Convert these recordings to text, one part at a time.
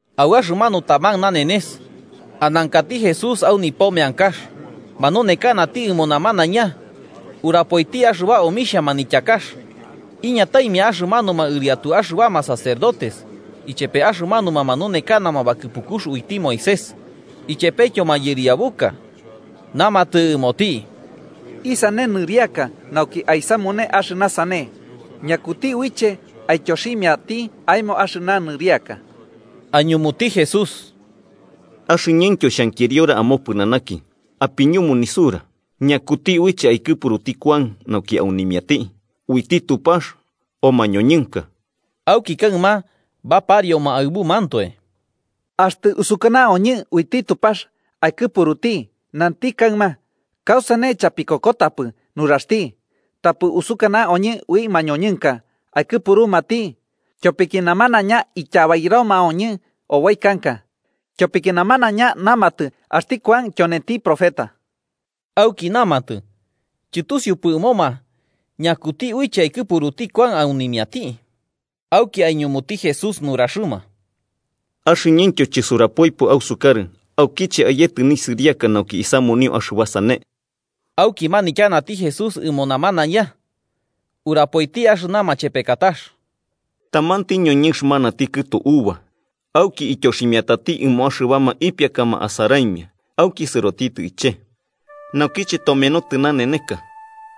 Au axɨmanu taman nanenes, anankati Jesús au nipo meankax, manunekanati ɨmo namanaiña urapoiti axɨba omixhia manityakax, iñataimia axɨmanuma ɨriatu axɨbama sacerdotes ichepe axɨmanuma manunekanama bakɨpukux uiti Moisés, ichepetyo mayɨriabuka, namatɨ ɨmoti: –¿Isane nɨriaka nauki aisamune axɨna sane? ¿Ñakuti uiche aityoximiati aemo axɨna nɨriaka? Aiñumuti Jesús: –Axɨñɨntyo xhankiriora amopɨnanaki. Apiñumu nisura: ¿Ñakuti uiche aikɨpuruti Kuan nauki aunimiati, uiti Tupax o mañoñɨnka? Auki kaɨma baparioma aɨbumantoe: “Axtɨ usukanaoñɨ uiti Tupax aikɨpuruti, nanti kaɨma: ‘¿Kausane chapikokotapɨ nuraxti?’ Tapɨ usukana oñɨ ui mañoñɨnka aikɨpurumati, tyopiki namanaiña ityabairomaoñɨ oboi kanka, ityopiki namanaiña namatɨ axti Kuan tyonenti profeta.” Auki namatɨ chɨtusiupɨ ɨmoma ñakuti uiche aikɨpuruti Kuan aunimiati. Auki aiñumuti Jesús nuraxɨma: –Axɨñɨntyo chisurapoipɨ ausukarɨ aukiche ayetɨ nisɨriaka nauki isamunio axɨba sane. Auki manityanati Jesús ɨmo namanaiña, urapoiti axɨna machepekatax: “Tamanti ñoñɨnx manati kɨtu uva, auki ityoximiatati ɨmo axɨbama ipiakama asaraimia auki sɨrotitɨ iche'e. Naukiche tomenotɨ naneneka,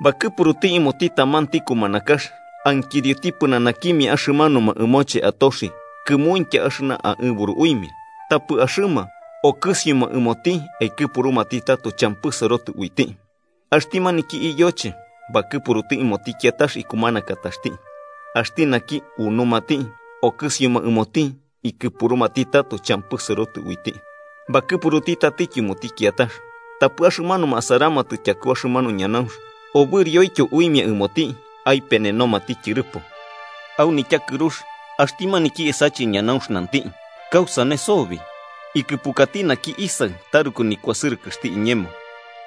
bakɨpuruti ɨmoti tamanti kumanakax ankirioti pɨnanakimia axɨmanuma ɨmoche atoxi kɨmuintya axɨna aɨburu uimia. Tapɨ axɨma okɨsioma ɨmoti aikɨpurumati tato champɨ sɨrotɨ uiti. Axti maniki iyoche bakɨpuruti ɨmoti kiatax ikumanakataxti. Axti naki unumati, okɨsioma ɨmoti ikɨpurumati tato champɨ sɨrotɨ uiti. Bakɨpuruti tatityo ɨmoti kiatax, tapɨ axɨmanuma asaramatɨ tyaku axɨmanu ñanaunx obɨrioityo uimia ɨmoti aipenenomati tyɨrɨpo. “Au nityakɨrux axti maniki esache ñanaunx nanti: ‘¿Kausane sobi? Ikɨpurkati naki isaɨ taruku nikuasɨrɨxti iñemo.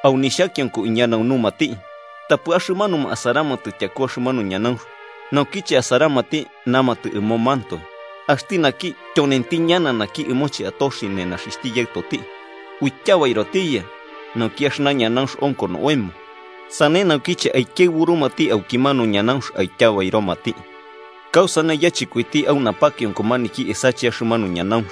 Au nixhakionko iñanaunumati.’ Tapɨ axɨmanuma asaramatɨ tyaku axɨmanu ñanaunx naukiche asaramati, namatɨ ɨmomantoe: ‘Axti naki tyonenti ñana naki ɨmoche atoxi nenaxixhti yaɨtoti. Uityabairotiya, nauki axɨna ñanaunx onko oemo.’ Sane naukiche aikiaɨburumati aukimanu ñanaunx aityabairomati. “¿Kausane yachɨkoiti au napakionko maniki esache axɨmanu ñanaunx?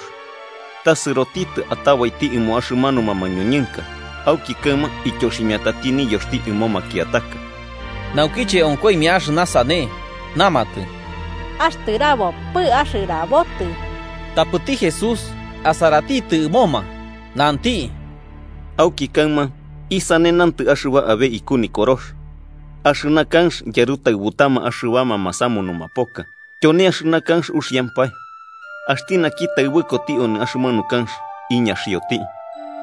Ta Sɨrotitɨ atabaiti ɨmo axɨmanuma mañoñɨnka, auki kaɨma ityoximiatati niyoxti ɨmo makiataka.” Naukiche onkoimia axɨna sane, namatɨ: –¡Axtɨrabopɨ axɨrabotɨ! Tapɨti Jesús asaratitɨ ɨmoma, nanti: –Auki kaɨma ¿isane nantɨ axɨba abe iku Nikorox?: ‘Axɨna kanx yarutaɨbutama axɨbama masamunuma poka tyone axɨna kanx uxiampae.’ Axti naki taɨbɨkoti onɨ axɨmanu kanx, iñaxioti.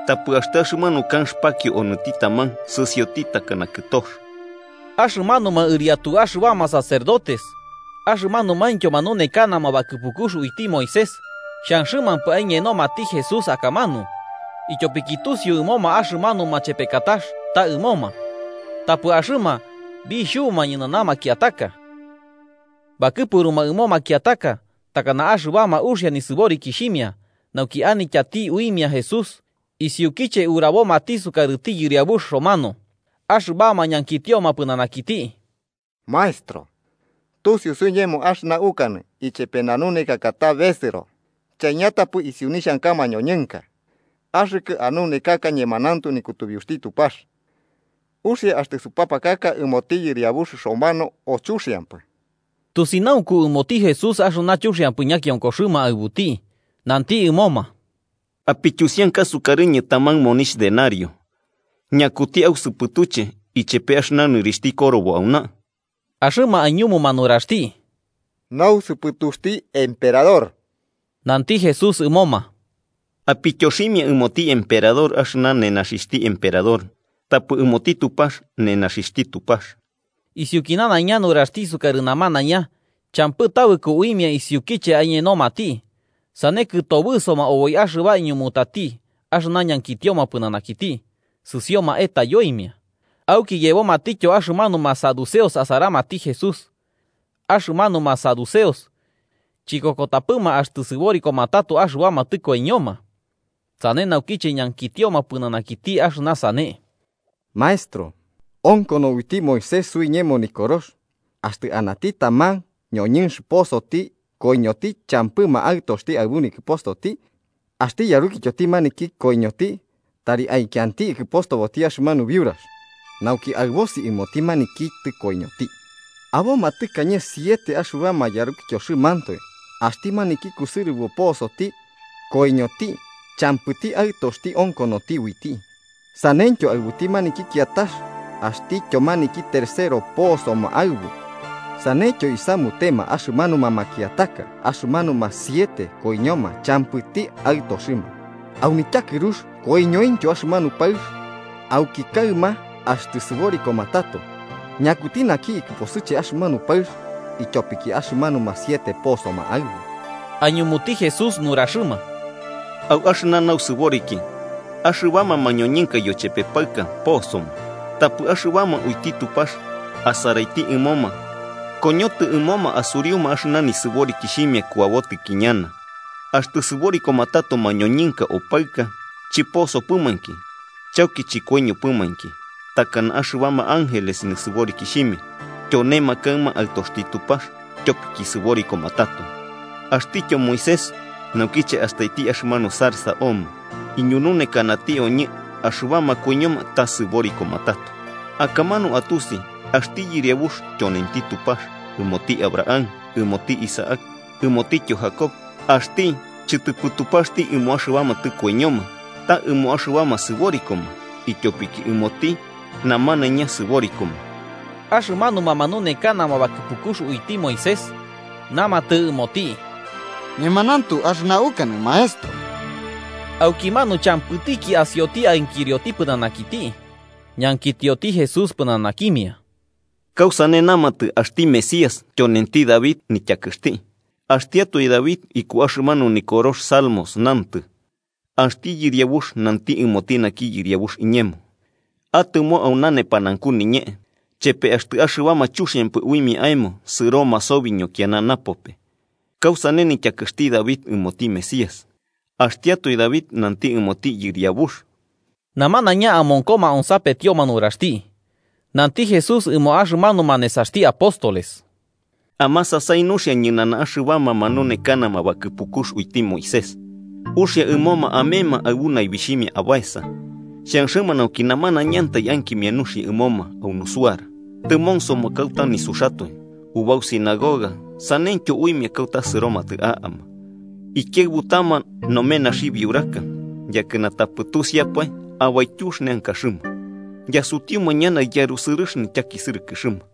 Tapɨ axtɨ axɨmanu kanx pakio onɨti taman, sɨsioti takana kɨtox. Axɨmanuma ɨriatu axɨbama sacerdotes axɨmanumaintyo manunekanama bakɨpukux uiti Moisés xhanxɨpɨma aiñenomati Jesús akamanu, ityopiki tusiu ɨmoma axɨmanu machepekatax ta ɨmoma. Tapɨ axɨma bixhubuma ñɨnana makiataka. Bakɨpuruma ɨmo makiataka, takana axɨbama uxia nisɨborikixhimia, nauki anityati uimia Jesús isiukiche urabomati sukarɨti yɨriabux romano. Axɨbama ñankitioma pɨnanakiti: –Maestro, tusiu suiñemo axɨna ukanɨ ichepe nanunekaka ta besɨro, chaiñatapɨ isiu nixhanka mañoñɨnka. Axɨkɨ anunekaka ñemanauntu nikutubiuxti Tupax. ¿Uxia axtɨ supapakaka ɨmoti yɨriabux romano, o chuxiampɨ? Tusinaunku ɨmoti Jesús axɨna chuxiampɨ ñakionkoxɨma aɨbuti, nanti ɨmoma: 24–Apityusianka sukarɨñɨ taman monixh denario. ¿Ñakuti ausɨpɨtuche ichepe axɨna nɨrixhti korobo auna? Axɨma aiñumuma nuraxti: –Nausɨpɨtuxti emperador. Nanti Jesús ɨmoma: –Apityoximia ɨmoti emperador axɨna nenaxixhti emperador, tapɨ ɨmoti Tupax nenaxixhti Tupax. Isiuki nanaiña nuraxti isukarɨ namanaiña champɨ tabɨko uimia isiukiche aiñenomati, sane kɨtobɨsoma oboi axɨba iñumutati axɨna ñankitioma pɨnanakiti sɨsioma etayoimia. Auki yebomatityo axɨmanuma saduceos asaramati Jesús. Axɨmanuma saduceos chikokotapɨma axtɨ sɨborikoma tato axɨbama tɨkoiñoma. Sane naukiche ñankitioma pɨnanakiti axɨna sane: 28–Maestro, onkono uiti Moisés suiñemo nikorox axtɨ anati taman ñoñɨnx posoti koiñoti champɨma aɨtoxti aɨbu nikɨpostoti, axti yarukityoti maniki koiñoti tari aikianti ikɨpostoboti axɨmanu biurax, nauki aɨbosi ɨmoti maniki tɨkoiñoti. Aboma tɨkañe siete axɨbama yarukityoxɨmantoe, axti maniki kusɨrɨbo posoti, koiñoti champɨti aɨtoxti onkonoti uiti. Saneityo aɨbuti maniki kiatax axtityo maniki tercero posoma aɨbu, saneityo isamutema axɨmanuma makiataka, axɨmanuma siete koiñoma champɨti aɨtoxɨma. Au nityakɨrux koiñointyo axɨmanu paɨx. Auki kaɨma, axtɨ sɨborikoma tato, ¿ñakuti naki ikɨposɨche axɨmanu paɨx, ityopiki axɨmanuma siete posoma aɨbu? Aiñumuti Jesús nuraxɨma: –Au axɨna nausɨboriki, axɨbama mañoñɨnka yochepe paɨka posoma. Tapɨ axɨbama uiti Tupax asaraiti ɨmoma koñotɨ ɨmoma asuriuma axɨna nisɨborikixhimia kuabotɨki ñana, axtɨ sɨborikoma tato mañoñɨnka o paɨka, chɨposopɨmainki, chauki chɨkoiñopɨmainki. Takana axɨbama ángeles nisɨborikixhimia, tyonema kaɨma aɨtoxti Tupax tyopiki sɨborikoma tato. Axtityo Moisés, naukiche astaiti axɨmanu zarza omo, iñununekanati oñɨ axɨbama koiñoma ta sɨborikoma tato. Akamanu atusi axti Yɨriabux tyonenti Tupax ɨmoti Abraham, ɨmoti Isaac ɨmotityo Jacob. ¡Axti chɨtɨpɨ Tupaxti ɨmo axɨbama tɨkoiñoma, ta ɨmo axɨbama sɨborikoma, ityopiki ɨmoti namanaiña sɨborikoma! Axɨmanuma manunekanama bakɨpukux uiti Moisés namatɨ ɨmoti: –Ñemanauntu axɨna ukanɨ, Maestro. Aukimanu champɨtiki asioti ankirioti pɨnanakiti. Ñankitioti Jesús pɨnanakimia: –¿Kausane namatɨ axti Mesías tyonenti David nityakɨxti? Axtiatoe David, iku axɨmanu nikorox Salmos, nantɨ: ‘Axti Yɨriabux nanti ɨmoti naki Yɨriabux iñemo: Atɨmo auna nepanaunku niñee, chepe axtɨ axɨbama chuxiampɨ uimia aemo sɨroma sobi ñokiana napope.’ ¿Kausane nityakɨxti David ɨmoti Mesías, axtiatoe David nanti ɨmoti Yɨriabux? Namanaiña amonkoma onsapetioma nuraxti, nanti Jesús ɨmo axɨmanuma nesaxti apóstoles: “Amasasai nuxia ñɨnana axɨbama manunekanama bakɨpukux uiti Moisés, uxia ɨmoma amema aɨbu naibixhimia abaesa, xhanxɨma nauki namanaiñantai ankimia nuxia ɨmoma au nusuara. Tɨmonsoma kauta nisuxatoe ubau sinagoga saneityo uimia kauta sɨromatɨ a'ama. Ikiaɨbutama nomenaxi biuraka, yakɨna tapɨ tusiapae abaityux neankaxɨma. Yasutiuma ñana yarusɨrɨx nityakisɨrɨkɨxɨma.”